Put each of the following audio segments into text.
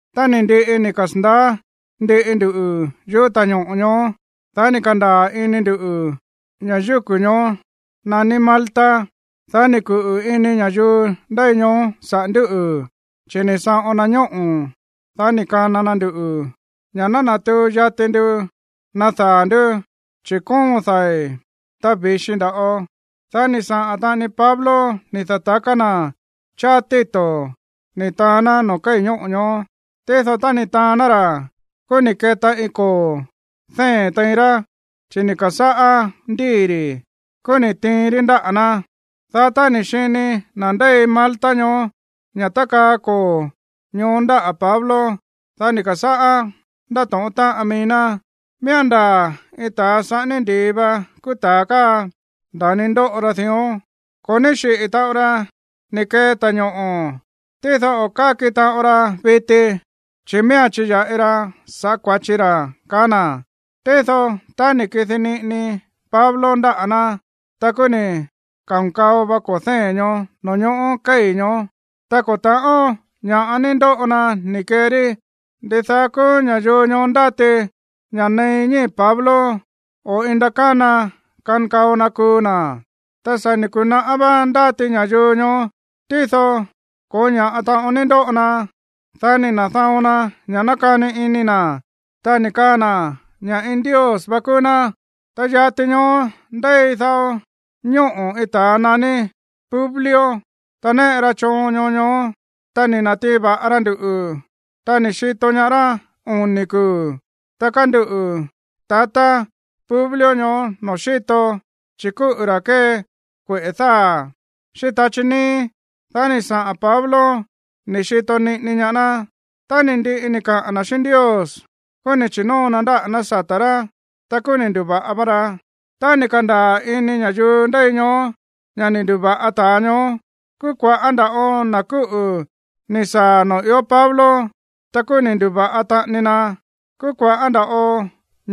Tá ni̱ ndiꞌi ni̱ kasa̱ndaá ndiꞌi ndu yúꞌu̱ ta̱ñoꞌo̱ ñoó, dá ni̱ ka̱ndaa̱ ini ndu̱ ña̱ yúku̱ ñoó naní Malta. Dá ni̱ kuꞌu̱ ini ña̱yuu ndéi ñoó saꞌa̱ ndúꞌu̱, chi̱ ni̱ saꞌon na ñóꞌo̱, dá ni̱ kana na nduꞌu̱ ña̱ ná natuu yati ndu nadaa̱ ndú, chi̱ kóon dai̱, ta vi̱xi nda̱ꞌo. Dá ni̱ saꞌa̱n taꞌani Pablo ni̱ da̱taká na̱ cháá títo̱ ni̱ taán ná noo̱ kéi̱ ñóꞌo̱ ñoó. Tído tá ni̱ taán ná ra̱, kúú ni̱ keta iin koo̱ dée̱n tein rá, chi̱ ni̱ ka̱sáꞌá ndii̱ ri̱. Kúú ni̱ tiin rí ndáꞌa̱ ná. Dá tá ni̱ xini na̱ ndéi Malta ñoó ña̱ tákaa koo̱ ñoó ndáꞌa̱ Pablo, dá ni̱ ka̱sáꞌá ndátóꞌón táꞌan mií ná: ―Miía̱n ndaa̱ iin ta̱a saꞌání ndi̱i va kúú ta̱a káa, nda̱ni ndóꞌo ra dión. Ko̱ ní xíꞌi̱ taꞌon ra ni̱ kee ta̱ñoꞌo̱, tído o̱ káki taꞌon ra viti, chi̱ miía̱n chiya̱ꞌi ra sa̱ꞌá kua̱chi ra̱ ―kaá na̱. Tído tá ni̱ kidi niꞌini Pablo ndáꞌa̱ ná, ta kúú ni̱ ka̱nkao va koo̱ dée̱n ñoó noo̱ ñoꞌó kéi̱ ñoó, ta ko̱ ta̱ꞌón ña̱ꞌa ni̱ ndoꞌo na ni̱ kee rí. Ndidaá kúú ña̱yuu ñoó ndáti ña̱ nein ñíi̱ Pablo, o iin ndakána kankao na kuu na̱. Ta sa̱ ni̱ ku̱naꞌá vá ndáti ña̱yuu ñoó, tído ko̱ó ña̱ꞌa taꞌon ni̱ ndoꞌo na. Dá ni̱ na̱da̱on na ña̱ nákani ini na̱, ta ni̱ kaa na̱ ña̱ iin ndios vá kúú ná. Ta yati ñoó ndéi dao ñóꞌo̱ iin ta̱a naní Publio, ra̱ néꞌe choon ñoo ñoó. Ta ni̱ na̱tiin va̱ꞌa ra nduꞌu̱, ta ni̱ xito ñaá rá oni̱ kuu̱. Ta kánduꞌu̱ tatá Publio ñoó noo̱ xíto, chi̱ kúꞌu̱ ra̱ kée kueꞌe̱ dáa̱ xíꞌín tachí níí. Dá ni̱ saꞌa̱n Pablo ni̱ xito niꞌini ñaá ná. Tá ni̱ ndiꞌi ni̱ kaꞌa̱n na̱ xíꞌín Ndios, kúú ni̱ chi̱nóo na ndáꞌa̱ ná sata̱ rá. Ta kúú ni̱ ndu̱va̱ꞌa va ra. Tá ni̱ ka̱ndaa̱ ini ña̱yuu ndéi ñoó ña̱ ni̱ ndu̱va̱ꞌa ta̱a ñoó, kúú kua̱ꞌá nda̱ꞌo na̱ kúꞌu̱ ni̱ saa̱ noo̱ ió Pablo, ta kúú ni̱ ndu̱va̱ꞌa taꞌani na. Kúú kua̱ꞌá nda̱ꞌo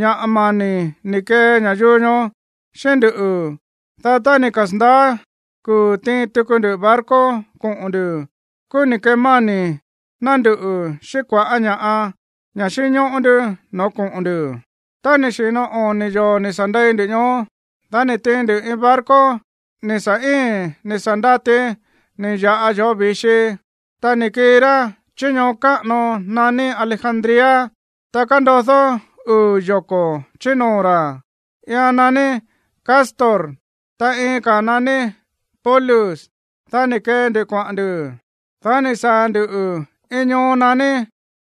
ña̱ mani̱ ni̱ kee ña̱yuu ñoó xíꞌín nduꞌu̱. Dá tá ni̱ kasa̱ndaá kuu̱ tiin tuku ndu barco koꞌo̱n ndu̱, kúú ni̱ kemáni̱ ná nduꞌu̱ xíꞌín kua̱ꞌá ña̱ꞌa, ña̱ xínñóꞌó ndú no̱ó koꞌo̱n ndu̱. Tá ni̱ xi̱no oni̱ yoo̱ ni̱ sa̱ ndei ndu ñoó, dá ni̱ tiin ndu iin barco ni̱ sa̱ íi̱n ni̱ sa̱ ndati ni̱ ya̱ꞌa yoo̱ vi̱xi. Ta ni̱ kii ra chí ñoo káꞌano naní Alejandría, ta kándodó uu̱ yoko̱ chí noo̱ ra̱. Iian naní Cástor, ta iin ka̱a̱n naní Pólux. Dá ni̱ kee ndu kuaꞌa̱n ndu̱. Dá ni̱ saa̱ ndu̱ iin ñoo naní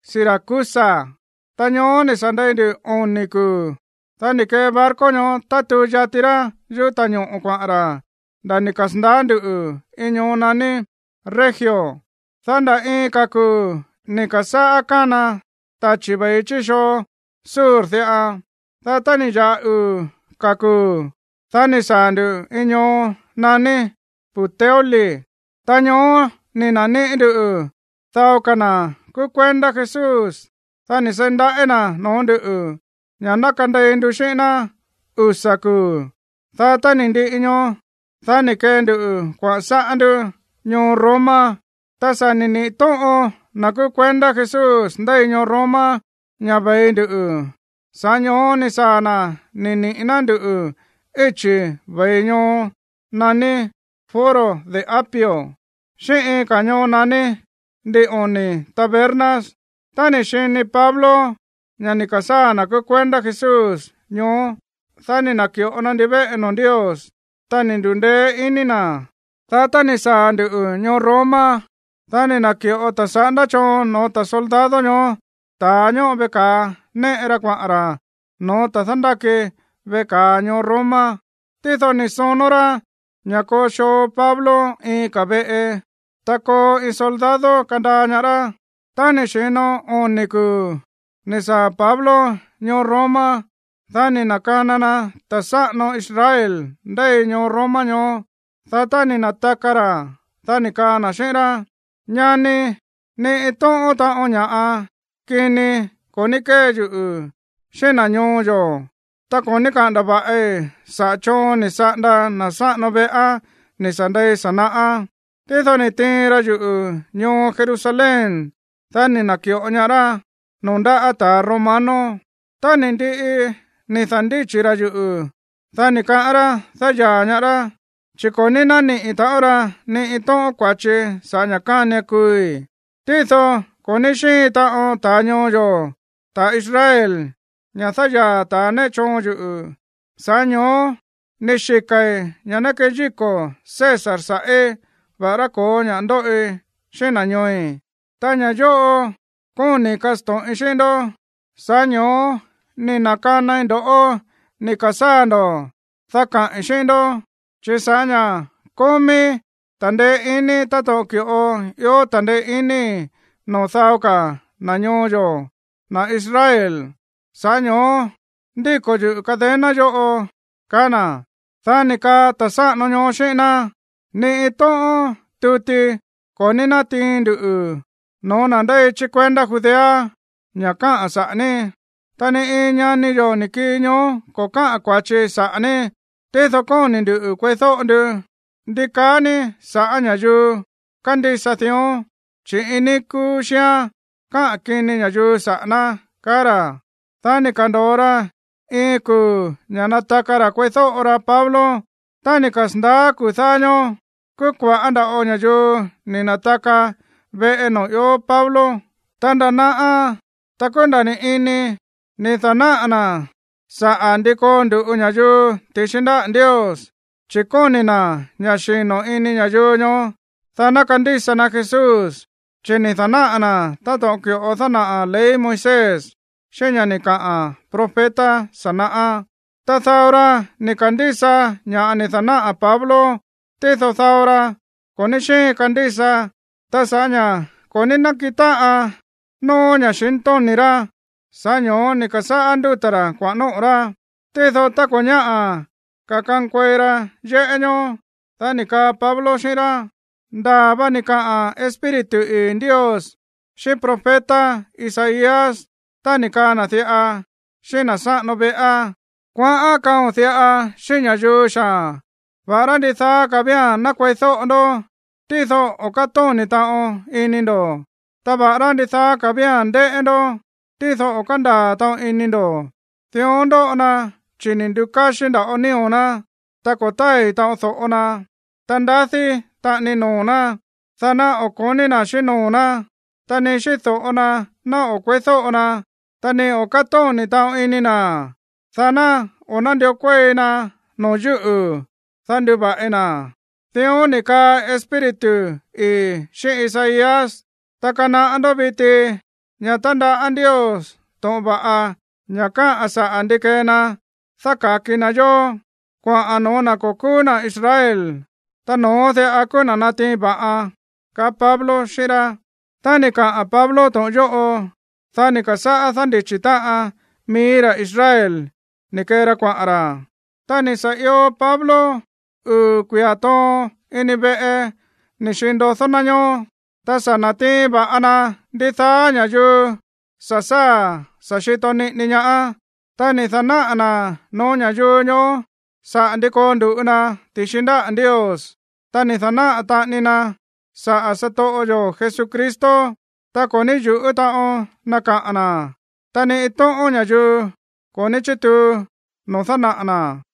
Siracusa. Ta ñoó ni̱ sa̱ ndei ndu oni̱ kuu̱. Dá ni̱ kee barco ñoó tátuu yati ra yuꞌú ta̱ñoꞌo̱ kuaꞌa̱n ra̱ nda̱ ni̱ kasa̱ndaá ndu̱ iin ñoo naní Regio. Dá nda̱ iin ka̱ kuu̱ ni̱ ka̱sáꞌá kána tachi̱ ve̱i chí xoo sur diꞌa. Dá tá ni̱ ya̱ꞌa uu̱ ka̱ kuu̱, dá ni̱ saa̱ ndu̱ iin ñoo naní Puteoli. Ta ñoó ni̱ na̱níꞌi̱ ndú dao ka̱ na̱ kúú kuendá Jesús. Dá ni̱ seí ndaꞌí na̱ noo̱ ndúꞌu̱ ña̱ ná kandei ndu xíꞌín ná usa̱ kuu̱. Dá tá ni̱ ndiꞌi ñoó, dá ni̱ kee ndu kuaꞌa̱n sáꞌá ndú ñoo Roma. Ta sa̱ ni̱ niꞌi̱ tóꞌon na̱ kúú kuendá Jesús ndéi ñoo Roma ña̱ ve̱i ndu, sa̱ꞌá ño̱ó ni̱ saa̱ na̱ ni̱ niꞌi̱ ná nduꞌu̱ íchi̱ ve̱i ñoo naní Foro de Apio xíꞌín iin ka̱ ñoo naní Ndin oni̱ Tabernas. Tá ni̱ xini Pablo ña̱ ni̱ ka̱sáa̱ na̱ kúú kuendá Jesús ñoó, dá ni̱ na̱ki̱ꞌo na ndivéꞌe noo̱ Ndios, ta ni̱ ndu̱ndeé iní na̱. Dá tá ni̱ saa̱ ndu̱ ñoo Roma, dá ni̱ na̱ki̱ꞌo ta̱ saꞌándá choon noo̱ soldado ñoó ta̱a ñóꞌo veꞌe ka̱a néꞌe ra kuaꞌa̱n ra̱ no̱ó ta̱a dándáki veꞌe ka̱a ñoo Roma. Tído ni̱ sonó rá ña̱ koo xoo Pablo iin ka̱ veꞌe, ta koo iin soldado kandaa ñaá rá. Tá ni̱ xi̱no oni̱ kuu̱ ni̱ saa̱ Pablo ñoo Roma, dá ni̱ na̱kana na ta̱ sáꞌano Israel ndéi ñoo Roma ñoó. Dá tá ni̱ na̱taka ra̱, dá ni̱ kaa na̱ xíꞌín rá: ―Ñani, ni iin tóꞌón taꞌon ña̱ꞌa kini ko̱ ní kée yuꞌu̱ xíꞌín na̱ ñoo yo̱, ta ko̱ ní káꞌa̱n ndava̱ꞌi saꞌa̱ choon ni̱ saꞌanda na̱ sáꞌano veꞌá ni̱ sa̱ ndei sa̱ naꞌá. Tído ni̱ tiin ra yuꞌu̱ ñoo Jerusalén, dá ni̱ na̱ki̱ꞌo ñaá rá noo̱ ndáꞌa̱ ta̱ romano. Tá ni̱ ndiꞌi ni̱ da̱ndíchi̱ ra̱ yuꞌu̱, dá ni̱ kaꞌán rá dáyaa̱ ñaá rá, chi̱ ko̱ ní nániꞌi̱ taꞌon ra ni iin tóꞌón kua̱chii̱ sa̱ꞌá ña̱ kánian kuui̱. Tído ko̱ ní xíin taꞌon ta̱ ñoo yo̱, ta̱ Israel, ña̱ dáyaa̱ ta̱ néꞌe choon yuꞌu̱, sa̱ꞌá ño̱ó ni̱ xika̱i̱ ña̱ ná keyíko̱ César sa̱ꞌí, va̱ꞌará ko̱ó ña̱ꞌa ndóꞌi xíꞌín na̱ ñooi̱. Ta ña̱ yóꞌo kóni̱i̱ kasto̱ꞌin xíꞌín ndó, sa̱ꞌá ño̱ó ni̱ na̱kanai ndo̱ꞌó ni̱ ka̱sáa̱ ndo̱, dá kaꞌi̱n xíꞌín ndó, chi̱ sa̱ꞌá ña̱ kómíí ta̱ndeé iní táto̱ꞌon ki̱ꞌo ió ta̱ndeé iní noo̱ dao ka̱ na̱ ñoo yo̱, na̱ Israel, sa̱ꞌá ño̱ó ndíko̱ yuꞌu̱ cadena yóꞌo ―kaá na̱. Dá ni̱ kaa ta̱ sáꞌano ñoó xíꞌín ná: ―Ni iin tóꞌón tuti ko̱ ní nátiin nduꞌu̱ no̱ó na̱ ndéi chí kuendá Judea ña̱ káꞌa̱n saꞌa̱ ní. Ta ni iin ñani yo̱ ni̱ kii ñoó ko̱ káꞌa̱n kua̱chi saꞌa̱ ní. Tído kóni̱ ndu̱ kueídóꞌo ndu ndi kaá ní sa̱ꞌá ña̱yuu kándísa dión, chi̱ iin níí kúú xíán káꞌa̱n kini ña̱yuu saꞌa̱ ná ―kaá ra̱. Dá ni̱ ka̱ndo̱o ra iin kuu̱ ña̱ nataka ra̱ kueídóꞌo ra Pablo. Tá ni̱ kasa̱ndaá kuu̱ dáá ñóó, kúú kua̱ꞌá nda̱ꞌo ña̱yuu ni̱ na̱taka veꞌe noo̱ ió Pablo. Ta nda̱ naꞌa, ta kúú nda̱ ni̱ ini, ni̱ da̱náꞌa̱ na̱ saꞌa̱ ndi koo ndu̱ꞌu ña̱yuu ti̱xi ndáꞌa̱ Ndios, chi̱ kóni̱ na̱ ña̱ xino̱ ini ña̱yuu ñoó, dá ná kandísa na Jesús. Chi̱ ni̱ da̱náꞌa̱ na̱ táto̱ꞌon ki̱ꞌo dánaꞌa̱ ley Moisés, xíꞌín ña̱ ni̱ kaꞌa̱n profeta sa̱ naꞌá. Ta dao ra ni̱ ka̱ndísa ña̱ ni̱ da̱náꞌa̱ Pablo, tído dao ra, ko̱ ní xíin kandísa. Ta sa̱ꞌá ña̱ ko̱ ní nákiꞌin táꞌan nóó ña̱xintóni̱ rá, sa̱ꞌá ño̱ó ni̱ ka̱sáꞌá nduta̱ ra̱ kuaꞌa̱n nóꞌo̱ rá. Tído tá ko̱ ñáꞌa̱ ka̱ kankuei ra yéꞌé ñoó, dá ni̱ kaa Pablo xíꞌín rá: ―Ndaa̱ va ni̱ kaꞌa̱n Espíritu ii̱ Ndios xíꞌín profeta Isaías tá ni̱ kaa na̱ diꞌa xíꞌín na̱ sáꞌano veꞌá: Kuaꞌán kaꞌo̱n diꞌa xíꞌín ña̱yuu xaa̱n: Va̱ꞌará ndidaá ka̱ vía̱n ná kueídóꞌo ndó, tído o̱ kátóni̱ taꞌon ini ndo̱. Ta va̱ꞌará ndidaá ka̱ vía̱n ndéꞌé ndó, tído o̱ kándaa̱ taꞌon ini ndo̱. Dión ndoꞌo na chi̱ ni̱ ndu̱káxí nda̱ꞌo nío̱ ná. Ta ko̱ tái̱ taꞌon do̱ꞌo na. Ta ndadí taꞌani noo̱ ná, dá ná o̱ ko̱ní na̱ xíꞌín noo̱ ná, ta ni xíꞌín do̱ꞌo na ná o̱ kueídóꞌo na, ta ni o̱ kátóni̱ taꞌon ini na̱, dá ná o̱ nándió kuéi na noo̱ yúꞌu̱, dá nduva̱ꞌi na̱. Dión ni̱ kaꞌa̱n Espíritu ii̱ xíꞌín Isaías. Ta kanaꞌá ndó viti ña̱ tándaꞌá Ndios to̱ꞌon va̱ꞌa, ña̱ káꞌa̱n saꞌa̱ ndi kee na dáka̱ki na yó, kuaꞌa̱n no̱ó na̱ ko̱ kúú na̱ Israel, ta no̱ón diꞌa kúú na̱ natiin va̱ꞌan ―kaá Pablo xíꞌín rá. Tá ni̱ kaꞌa̱n Pablo to̱ꞌon yóꞌo, dá ni̱ ka̱sáꞌá dándichi̱ táꞌan mií ra̱ Israel ni̱ kee ra kuaꞌa̱n ra̱. Ta ni̱ sa̱ io Pablo uu̱ kuia̱ toon ini veꞌe ni̱ xiin ndodó ná ñoó. Ta sa̱ na̱tiin va̱ꞌa na ndidaá ña̱yuu sa̱ sáa̱ sa̱ xito niꞌini ñaá. Ta ni̱ da̱náꞌa̱ na̱ no̱ó ña̱yuu ñoó saꞌa̱ ndi koo ndu̱ꞌu na ti̱xi ndáꞌa̱ Ndios, ta ni̱ da̱náꞌa̱ taꞌani na saꞌa̱ satoꞌo yo̱ Jesucristo. Ta ko̱ ní yu̱ꞌú taꞌon na kaꞌa̱n na̱, ta ni iin tóꞌón ña̱yuu ko̱ ní chítuu noo̱ dánaꞌa̱ na̱.